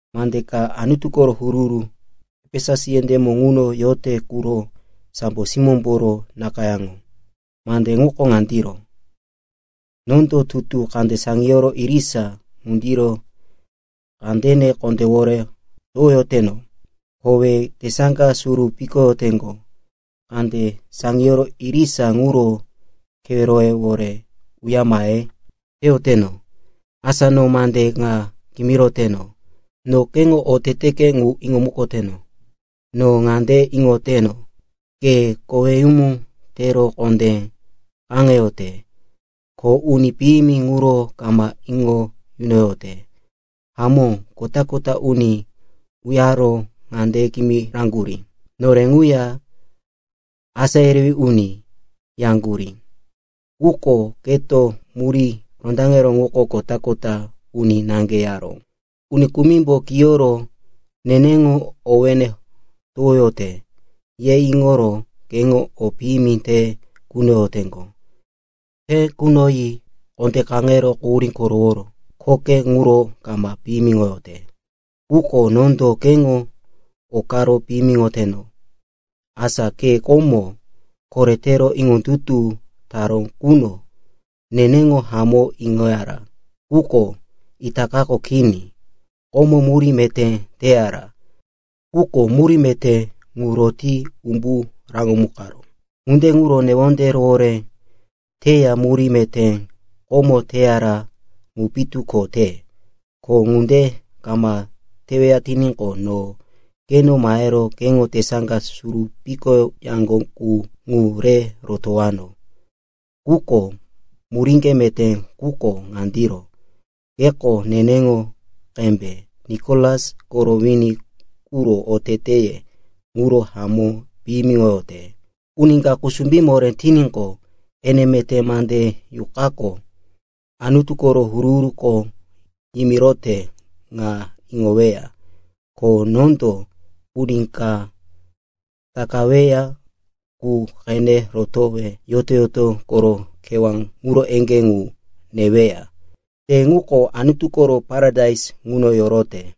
“Mande ka Anutu koro huru-huru Efesus yendémo ŋuno yote quro sambo simóyemboro nakayáŋo. Mande ŋuko ŋandiro: Nondo tutu kande saŋiyoro irisa ŋundiro kandene kondéwore towoyoteno. Kowe tesaŋga suru pikoyaŋgo kande saŋiyoro irisa ŋuro keweroyewore uya mahe teyoteno. Asa no mande ŋa kimiroteno. No keŋo oteteke ŋu iŋomukoteno. No ŋande iŋoteno, ke koweyumu tero kondé kaŋeyote, ko uni piyimi ŋuro kama iŋo yunoyote. Hamó, kota-kota uni uyaro ŋande kimiraŋgurí, ‘Nore ŋuya asá yerewí uni,’ yaŋgurí. Quko keto muríye rondaŋero ŋuko kota-kota uni naŋge yaró. Uni kumimbo kiyoro, neneŋo owéne towoyote, ye iŋoro keŋo o piyimi te kunoyoteŋgo. Te kunoyi kondé kaŋero quhurí koroworo khoke ŋuro kama piyimiŋoyote. Quko nondo keŋo okaro piyimiŋoyoteno. Asa ke komo koretero iŋondutu taró quno, neneŋo hamó iŋoyara, quko itakako kini. Komo murí meté teyara, quko murí meté ŋu roti umbu raŋomukaró. Ŋunde ŋuro newonde rohoré teya murí meté komo teyara ŋu pitu ko te. Ko ŋunde kama teweya tiníqo, no keno mahero keŋo tesaŋga suru pikoyaŋgo qu ŋu re rotowano. Quko muríŋge meté quko ŋandiro. Keko neneŋo qembe Nikolas koro wini quro oteteye ŋuro hamó piyimiŋoyote. Uni ka kusumbí moré tiníqo, ene meté mande Yuqako Anutu koro huru-huruko yimirote ŋa iŋoweya. Ko nondo uni ka takaweya qu qene rotowe yoto-yoto koro kewá ŋuro eŋgé ŋu neweya. Te ŋuko Anutu koro paradais ŋuno yorote.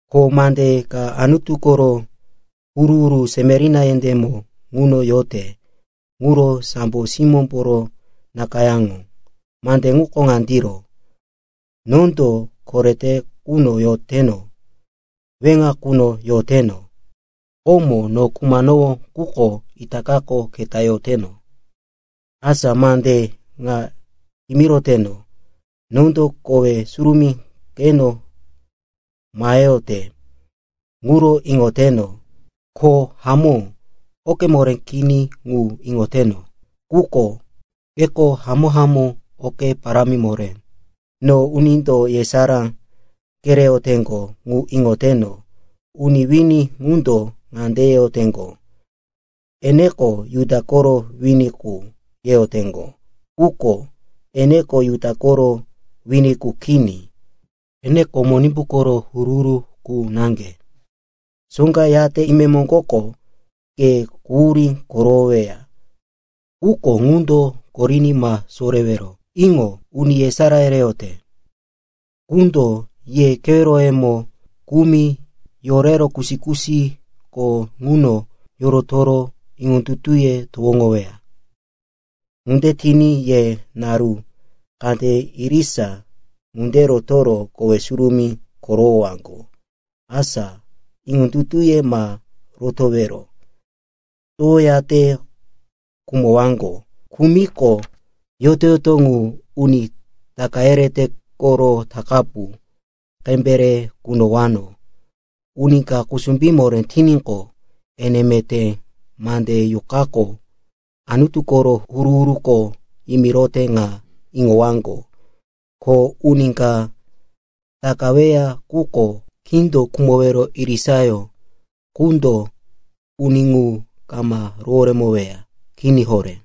“Ko mande ka Anutu koro huru-huru Semerina yendémo ŋuno yote quro sambo simóyemboro nakayáŋo. Mande ŋuko ŋandiro: Nondo korete quno yoteno, weŋa quno yoteno. Komo no khumanowó, quko itakako keta yoroteno. Asa mande ŋa kimiroteno. Nondo kowe surumí keno maheyote ŋuro iŋoteno, ko hamó oke moré kini ŋu iŋoteno. Quko keko hamó-hamó oke parámi moré. No unindo yesará kereyoteŋgo ŋu iŋoteno. Uni wini ŋundo ŋande yeyoteŋgo, eneko Juda koro wini qu yeyoteŋgo. Quko eneko Juda koro wini qu kini. Eneko Monimbu koro huru-huru qu naŋge. Soŋga yate imemoŋgoko ke quhurí korowoweya, quko quhurí ŋundo koriní ma sorewero. Iŋo, uni yesará yereyote qundo ye keweroyemo kumi yorero kusi-kusiko ŋuno yorotoro iŋondutuye towoŋoweya. Ŋunde tiní ye naru kande irisa ŋunde rotoro kowe surumí korowowaŋgo. Asa iŋondutuye ma rotowero towoyate khumowaŋgo. Khumiqo, yoto-yoto ŋu, uni taka yerete koro takapu qembe, re kunowano. Uni ka kusumbí moré tiníqo, ene meté mande Yuqako Anutu koro huru-huruko yimirote ŋa iŋowaŋgo. Ko uni ka takaweya quko, kindo khumowero irisayó qundo uni ŋu kama roworemoweya. Kini horé.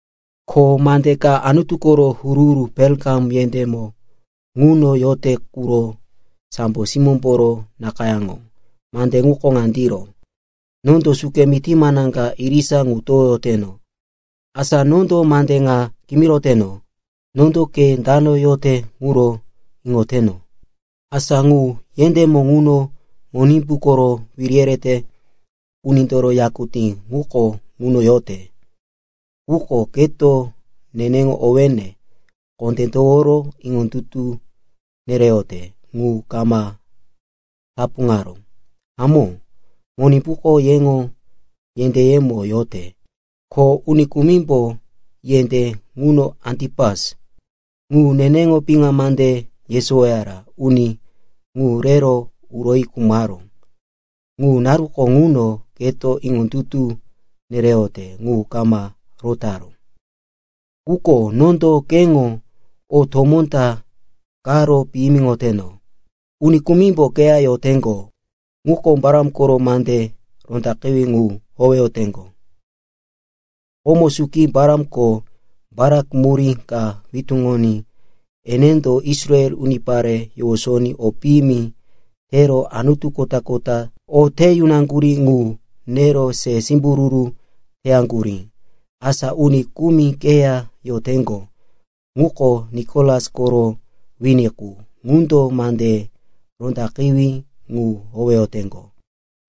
“Ko mande ka Anutu koro huru-huru Perikamum yendémo ŋuno yote quro sambo simóyemboro nakayáŋo. Mande ŋuko ŋandiro: Nondo suke mití manaŋga irisa ŋu towoyoteno. Asa nondo mande ŋa kimiroteno. Nondo ke dano yote ŋuro iŋoteno, asa ŋu yendémo ŋuno Monimbu koro wiri yerete unindoro yakutí ŋuko ŋuno yote. Quko keto neneŋo owéne kondé toworo iŋondutu nereyote ŋu kama tapuŋaró. Hamó, Monimbuko yeŋo yendéyemo yote, ko uni kumimbo yendé ŋuno Antipas, ŋu neneŋo piŋa mande yesowoyara uni ŋu rero uroyi khumaró. Ŋu naruko ŋuno keto iŋondutu nereyote ŋu kama rotaró. Quko nondo keŋo o tomó ta karo piyimiŋoteno. Uni kumimbo keya yoteŋgo, ŋuko Balam koro mande rondaqewí ŋu howeyoteŋgo. Komo suki Balamko Balak murí ka witúŋoní enendo Israel unipare yowosoní o piyimi tero anutu kota-kota o te yunaŋgurí ŋu nero se simbururu teyaŋgurí. Asa uni kumi keya yoteŋgo, ŋuko Nikolas koro wini qu, ŋundo mande rondaqewí ŋu howeyoteŋgo.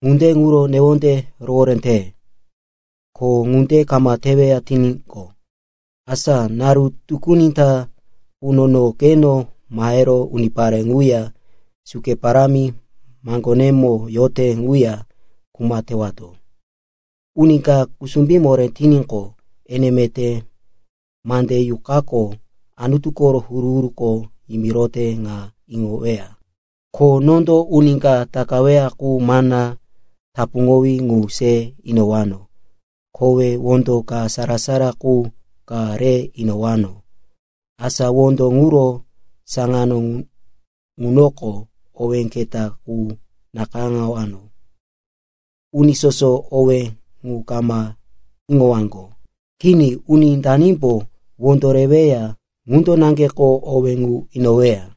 Ŋunde ŋuro newonde rohoré te. Ko ŋunde kama teweya tiníqo, asa naru tukuni ta quno no keno mahero unipare ŋuya suke parámi maŋgonemo yote ŋuya kuma tewato. Uni ka kusumbí moré tiníqo, ene meté mande Yuqako Anutu koro huru-huruko yimirote ŋa iŋoweya. Ko nondo uni ka takaweya qu mana tapuŋowí ŋu se inowano. Kowe wondo ka sara-sara qu ka re inowano. Asa wondo ŋuro saŋano ŋunoko owé keta qu nakayáŋowano. Uni soso owé ŋu kama iŋowaŋgo. Kini, uni danimbo wondo reweya, ŋundo naŋgeko owé ŋu iŋoweya.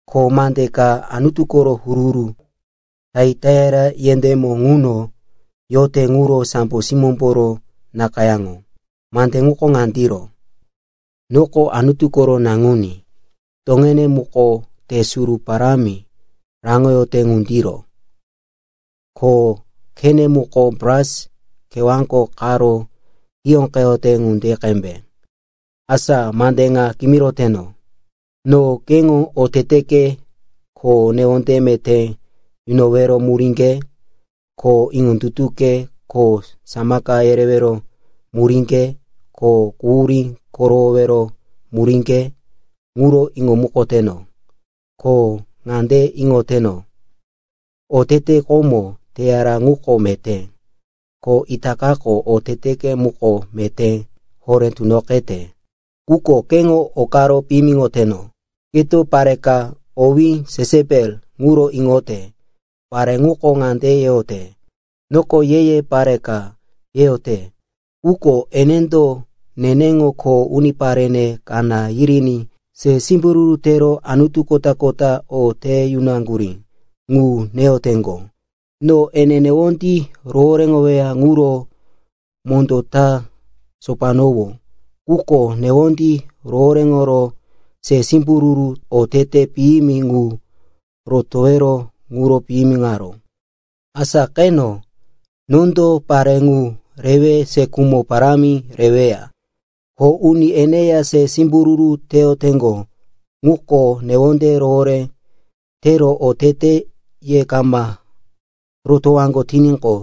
“Ko mande ka Anutu koro huru-huru Taiataira yendémo ŋuno yote quro sambo simóyemboro nakayáŋo. Mande ŋuko ŋandiro: Noko Anutu koro Naŋuní. Toŋene muko te suru parámi raŋoyote ŋundiro, ko khene muko bras kewáko qaro hiyóqeyote ŋunde qembe. Asa mande ŋa kimiroteno. No keŋo oteteke ko newonde meté yunowero muríŋge ko iŋondutuke ko samaka yereyowero muríŋge ko quhurí korowowero muríŋge ŋuro iŋomukoteno. Ko ŋande iŋoteno, otete komo teyara ŋuko meté, ko itakako oteteke muko meté horé tunoqete. Quko keŋo okaro piyimiŋoteno. Keto pare ka owí Jesepel ŋuro iŋote. Pare ŋuko ŋande yeyote, ‘Noko ye-ye pare ka,’ yeyote. Quko enendo neneŋo kho uniparene kaná yiriní se simbururu tero anutu kota-kota o te yunaŋgurí ŋu neyoteŋgo. No ene newondí rohoréŋoweya ŋuro mondó ta sopanowó. Quko newondí rohoréŋoro se simbururu otete piyimi ŋu rotowero ŋuro piyimiŋaró. Asa qeno, nondo pare ŋu rewe se khumo parámi reweya. Ko uni eneya se simbururu teyoteŋgo ŋuko newonde rohoré tero oteteye kama rotowaŋgo tiníqo,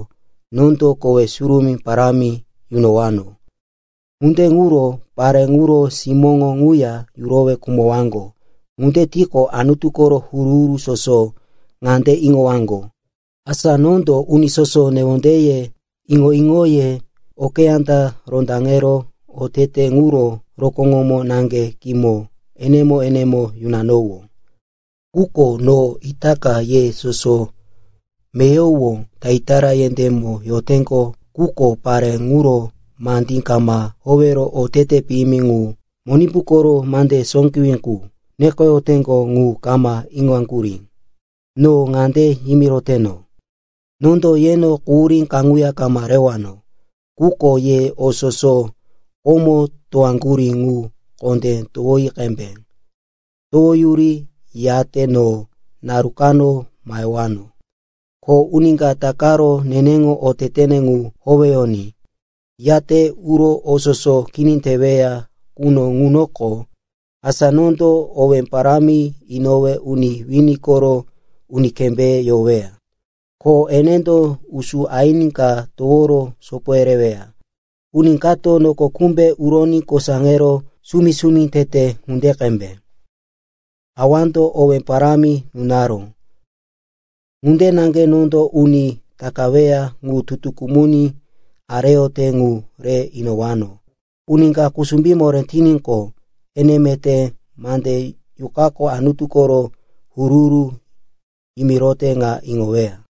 nondo kowe surumí parámi yunowano. Ŋunde yunoro pare ŋuro simóŋo ŋuya yurowe khumowaŋgo. Ŋunde tiqo, Anutu koro huru-huru soso ŋande iŋowaŋgo, asa nondo uni soso newondeye, iŋo-iŋoye okeyá ta rondaŋero oteteye ŋuro rokóŋomo naŋge kimo enemo-enemo yunowano. Quko no itaka ye soso meyowo Taiataira yendémo yoteŋgo quko pare ŋuro mandí kama howero otete piyimi ŋu, ‘Monimbu koro mande sóqewí qu,’ nekoyoteŋgo ŋu kama iŋoyaŋgurí, no ŋande yimiroteno, nondo yeno quhurí kaŋuya kama rewano. Quko ye o soso komo towaŋgurí ŋu kondé towi qembe. Towoyuri, yate no naru kano mahewano. Ko uni ka takaro neneŋo otetene ŋu howeyoní, yate uro o soso kini teweya quno ŋunoko, asa nondo owé parámi inowe uni wini koro uni kembéye yoweya. ‘Ko enendo usú aini ka toworo sopo yereweya, uni kato noko kumbe uroní kosaŋero sumi-sumi tete ŋunde qembe.’ Awando owé parámi nunaró. Ŋunde naŋge nondo uni takaweya ŋu tutu kumuní areyote ŋu re inowano. Uni ka kusumbí moré tiníqo, ene meté mande Yuqako Anutu koro huru-huru yimirote ŋa iŋoweya.